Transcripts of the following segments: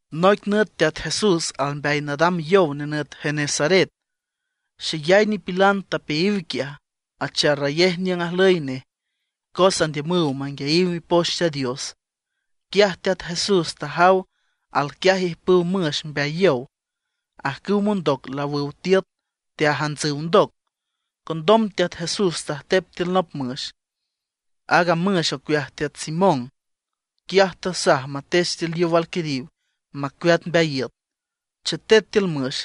Noic nüt Teat Jesús almbeay nadam yow nenüt Genesaret. Xeyay nipilan tapeayiw quiaj, acharrayej niüng ajlüy nej, cos andiümüw manguiayiw Mipoch Teat Dios. Quiaj Teat Jesús tajaw alquiaj ijpüw müx mbeay yow. Ajcüwa mondoc laawüw tiüt, teajantsüw ndoc. Condom Teat Jesús tajtep tiül nop müx, aaga müx ocueaj teat Simón. Quiaj tasaj matech tiül yow alquiriw macueat mbeay iüt. Chetet tiül müx,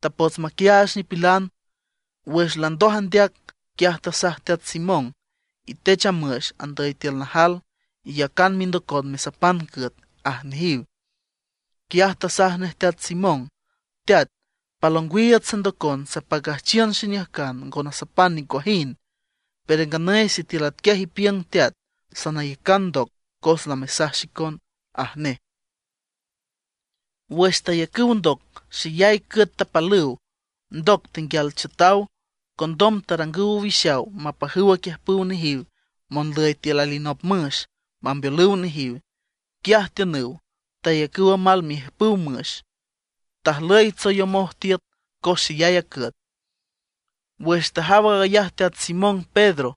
tapots maquiaach nipilan. Wüx landoj andeac, quiaj tasaj teat Simón: ―Itech a müx andüy tiül najal, iyacan mindocon mesapan cüet ―aj nejiw. Quiaj tasaj nej teat Simón: ―Teat, pal ongwiiüts sandocon sapacüjchiün xiniüjcan ngo nasapan nicuajind. Pero nganüy sitiül atquiaj ipiüng Teat, sanayacan ndoc cos lamesaj xicon ―aj nej. Wüx tayacüw ndoc xeyay cüet tapalüw, ndoc tenguial chiütaw. Condom tarangüw owixaw mapajüw aquiüjpüw nejiw monlüy tiül alinop müx, mambeolüw nejiw. Quiaj tiünüw, tayacüw amal miijpüw a müx. Tajlüy tsoyomoj tiüt cos xeyay a cüet. Wüx tajaw aag ayaj teat Simón Pedro,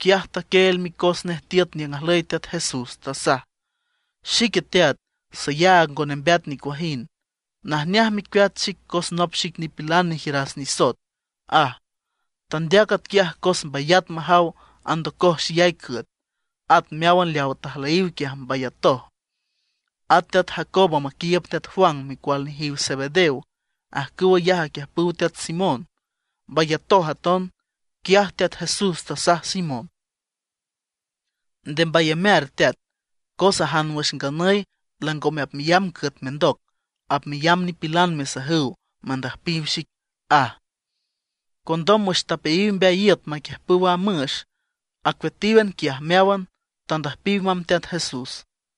quiaj taquieel micos nej tiüt niüng ajlüy Teat Jesús, tasaj: ―Xique Teat, sayaag ngo nembeat nicuajind, najneaj mecueat xic cos nop xic nipilan nejiüras nisoet ―aj. Tandeac atquiaj cos mbayat majaw andocoj xeyay cüet; at meáwan leawa tajlüyiw quiaj mbayatoj. At teat Jacobo maquiiüb teat Juan, micual nejiw teat Zebedeo, ajcüw ayaj aquiüjpüw teat Simón, mbayatoj aton. Quiaj Teat Jesús tasaj Simón: ―Nde mbayamear teat, cos ajan wüx nganüy langome apmeyamb cüet mendoc, apmeyamb nipilan mesajüw mandüjpiw xic ―aj. Condom wüx tapeayiw mbeay iüt maquiüjpüw a müx, acueatíwan quiaj meáwan, tandüjpiw mamb Teat Jesús.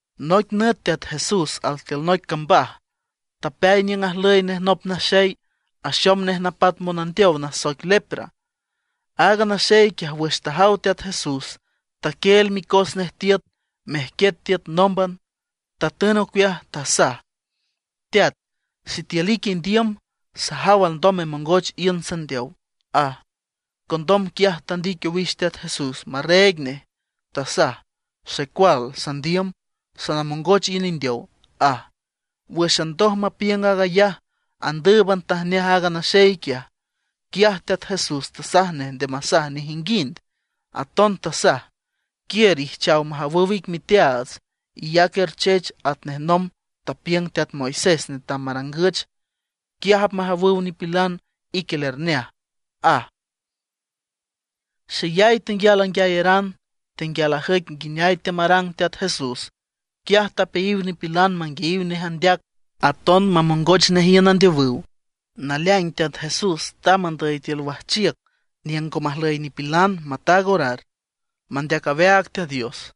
Noic nüt Teat Jesús altiül noic cambaj, tapeay niüng ajlüy nej nop naxey, axom nej napat monandeow nasoic lepra. Aaga naxey quiaj wüx tajaw Teat Jesús taquieel micos nej tiüt, mejquiet tiüt nómban, tatün ocueaj, tasaj: ―Teat, sitiül ique indiüm, sajaw alndom memongoch iün sandeow ―aj. Condom quiaj tandic owix Teat Jesús marreeg nej, tasaj: ―Xecual sandiüm, sanamongoch iün indeow ―aj. Wǘxan ndoj mapiüng aag ayaj, andǘüban tajneaj aaga naxey quiaj. Quiaj Teat Jesús tasaj nej nde masaj nejinguind. Aton tasaj: ―Quiür ijchaw majawüw ic miteaats, iyac erchech atnej nomb tapiüng teat Moisés netam marangüch. Quiaj apmajawüw nipilan ique lerneaj ―aj. Xeyay tenguial anguiayeran, tenguial ajüic nguineay teamarang Teat Jesús. Quiaj tapeayiw nipilan manguiayiw nej andeac, aton mamongoch nej iün andeowüw. Naleaing Teat Jesús tamb andüy tiül wajchiüc niüng ngo majlüy nipilan, mataag orar, mandeac aweaag Teat Dios.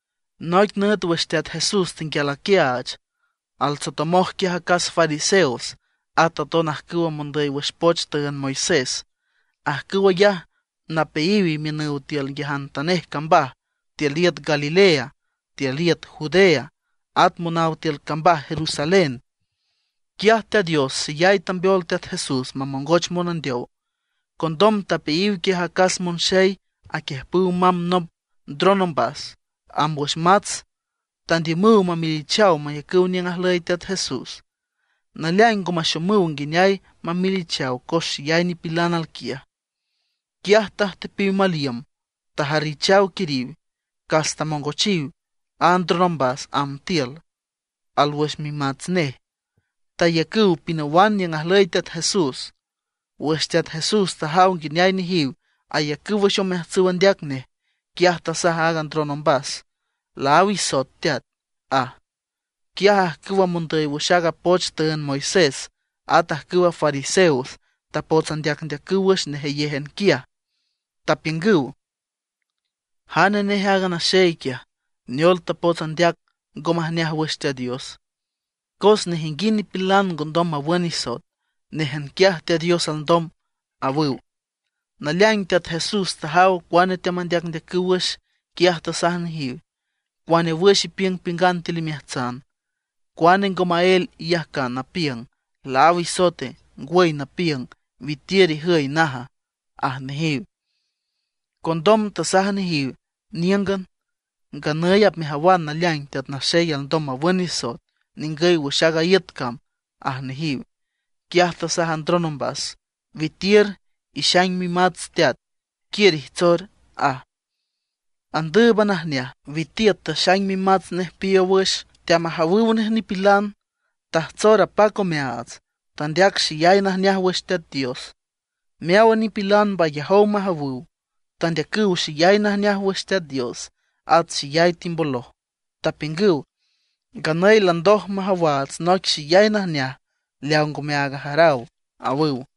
Noic nüt wüx Teat Jesús tenguial aquiaach, altsotomoj quiaj acas fariseos at aton ajcüwa mondüy wüx poch tüünd Moisés. Ajcüw ayaj napeayiw imiünüw tiül nguiajantanej cambaj tiül iüt Galilea, tiül iüt Judea, at monaw tiül cambaj Jerusalén. Quiaj Teat Dios xeyay tambeol Teat Jesús mamongoch monandeow. Condom tapeayiw quiaj acas monxey aquiüjpüw mamb nop ndron ombas, amb wüx mats. Tandiümüw mamelichaw mayacüw niüng ajlüy Teat Jesús. Naleaing ngo maxomüw nguineay mamelichaw cos xeyay nipilan alquiaj. Quiaj tajtepiw mal iüm, tajarrichaw quiriw. Cas tamongochiw a ndron ombas amb tiül, alwüx mimats nej. Tayacüw pinawan niüng ajlüy Teat Jesús. Wüx Teat Jesús tajaw nguineay nejiw ayacüw wüx omeajtsüw andeac nej, quiaj tasaj a ndron ombas: ―Laáw isoet teat ―aj. Quiaj ajcüwa mondüy wüx aaga poch tüünd Moisés, at ajcüwa fariseos tapots andeacndeacüw wüx nejeyéjan quiaj, tapiüngüw: “¿Jane nej aaga naxey quiaj, neol tapots andeac ngo majneaj wüx Teat Dios? Cos nejinguind nipilan ngondom mawün nisoet, néjan quiaj Teat Dios alndom”, awüw. Naleaing Teat Jesús tajaw cuane teamandeacndeacüw wüx, quiaj tasaj nejiw: ―¿Cuane wüx ipiüngpiüngan tiül imeajtsana? ¿Cuane ngo maél iyajcan napiüng: “Laáw isoete”, ngwüy napiüng: “Witiür ijüy, naja”? ―aj nejiw. Condom tasaj nejiw níüngan: ―Nganüy apmejawan naleaing Teat Naxey alndom mawün nisoet ningüy wüx aaga iüt cam ―aj nejiw. Quiaj tasaj a ndron ombas: ―Witiür, ixaing mimats teat, quiür ijtsor ―aj. Andǘüban ajneaj, witiüt taxaing mimats nej piiow wüx, teamajawüw nej nipilan, tajtsor apac omeaats, tandeac xeyay najneaj wüx Teat Dios. Meáwan nipilan mbayajow majawüw, tandeacüw xeyay najneaj wüx Teat Dios, at xeyay timboloj, tapiüngüw: ―Nganüy landoj majawaats noic xeyay najneaj leaw ngome aag ajaraw ―awüw.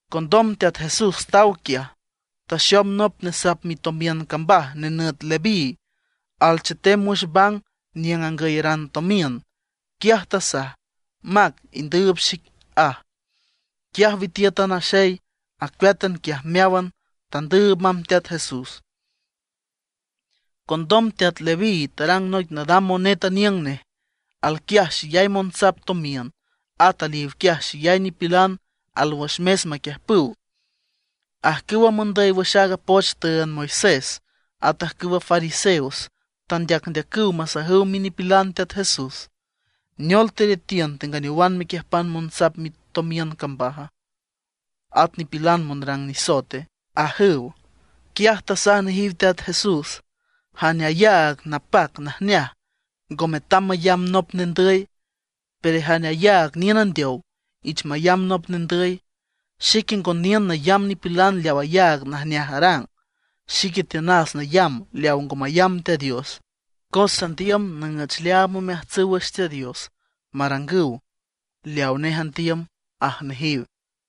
Condom Teat Jesús taw quiaj, taxom nop nesap mitomiün cambaj, nenüt Leví, alchetem wüx bang niüng angüyeran tomiün. Quiaj tasaj: ―Mac, indüüb xic ―aj. Quiaj witiüt a naxey, acueátan quiaj meáwan, tandüüb mamb Teat Jesús. Condom teat Leví tarang noic nadam monet aniüng nej. Alquiaj xeyay monsap tomiün, at aliw quiaj xeyay nipilan alwüx mes maquiüjpüw. Ajcüwa mondüy wüx aaga poch tüünd Moisés, at ajcüwa fariseos tandeacndeacüw masajüw minipilan Teat Jesús: ―¿Neol teretiün tenganeowan mequiüjpan monsap mitomiün cambaj, at nipilan monrang nisoete? ―ajüw. Quiaj tasaj nejiw Teat Jesús: ―Jane ayaag napac najneaj, ngo metam mayamb nop nendüy; pero jane ayaag niün andeow ich mayamb nop nendüy. Xique ngo niün nayamb nipilan leaw ayaag najneaj arang; xique tiünas nayamb leaw ngo mayamb Teat Dios, cos sandiüm nüüch leaam omeajtsüw wüx Teat Dios, marangüw leawa nej andiüm ―aj nejiw.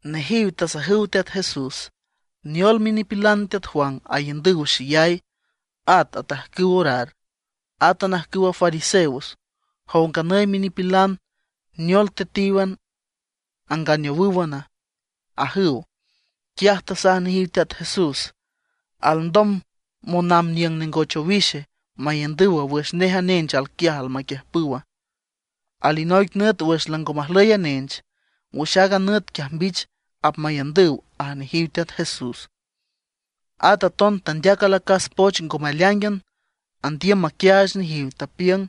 Nejiw tasajüw Teat Jesús: ―¿Neol minipilan teat Juan aiündüw xeyay, at atajcüw orar, átan ajcüwa fariseos? Jow nganüy minipilan, ¿neol tetíwan, anganeowǘwan? ―ajüw. Quiaj tasaj nejiw Teat Jesús: ―¿Alndom monamb niüng nengoch owixe maiündüwa wüx nej a nench alquiaj almaquiüjpüwa? Alinoic nüt wüx lango majlüy a nench, wüx aaga nüt quiaj mbich apmaiündüw ―aj nejiw Teat Jesús. At aton tandeac alacas poch ngome aleáingan, andiüm maquiaach nejiw, tapiüng: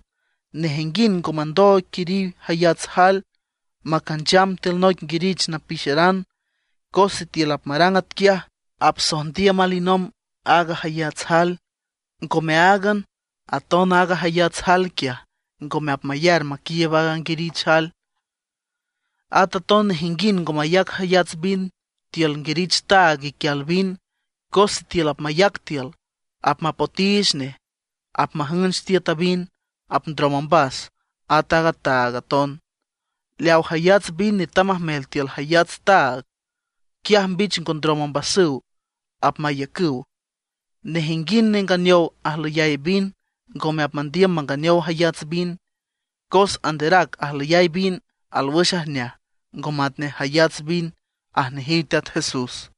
―Nejinguind ngo mandooig quiriw jayats jael macancham tiül noic nguirich napixeran, cos sitiül apmarang atquiaj, apsojndiüm alinomb aaga jayats jael. Ngome áagan, aton aaga jayats jael quiaj ngome apmayar maquiiüb aaga nguirich jael. At aton nejinguind ngo mayac jayats vin tiül nguirich taag iquial vin, cos sitiül apmayac tiül, apmapotiich nej, apmajünch tiüt a vin, apndrom ombas, at a taag aton. Leaw jayats vin netam majmel tiül jayats taag, quiaj mbich ngo ndrom ombasüw, apmaiücüw. Nejinguind nenganeow ajlüyay vin ngome apmandiüm manganeow jayats vin, cos anderac ajlüyay vin alwüx ajneaj, ngo matnej jayats vin ―aj nejiw Teat Jesús.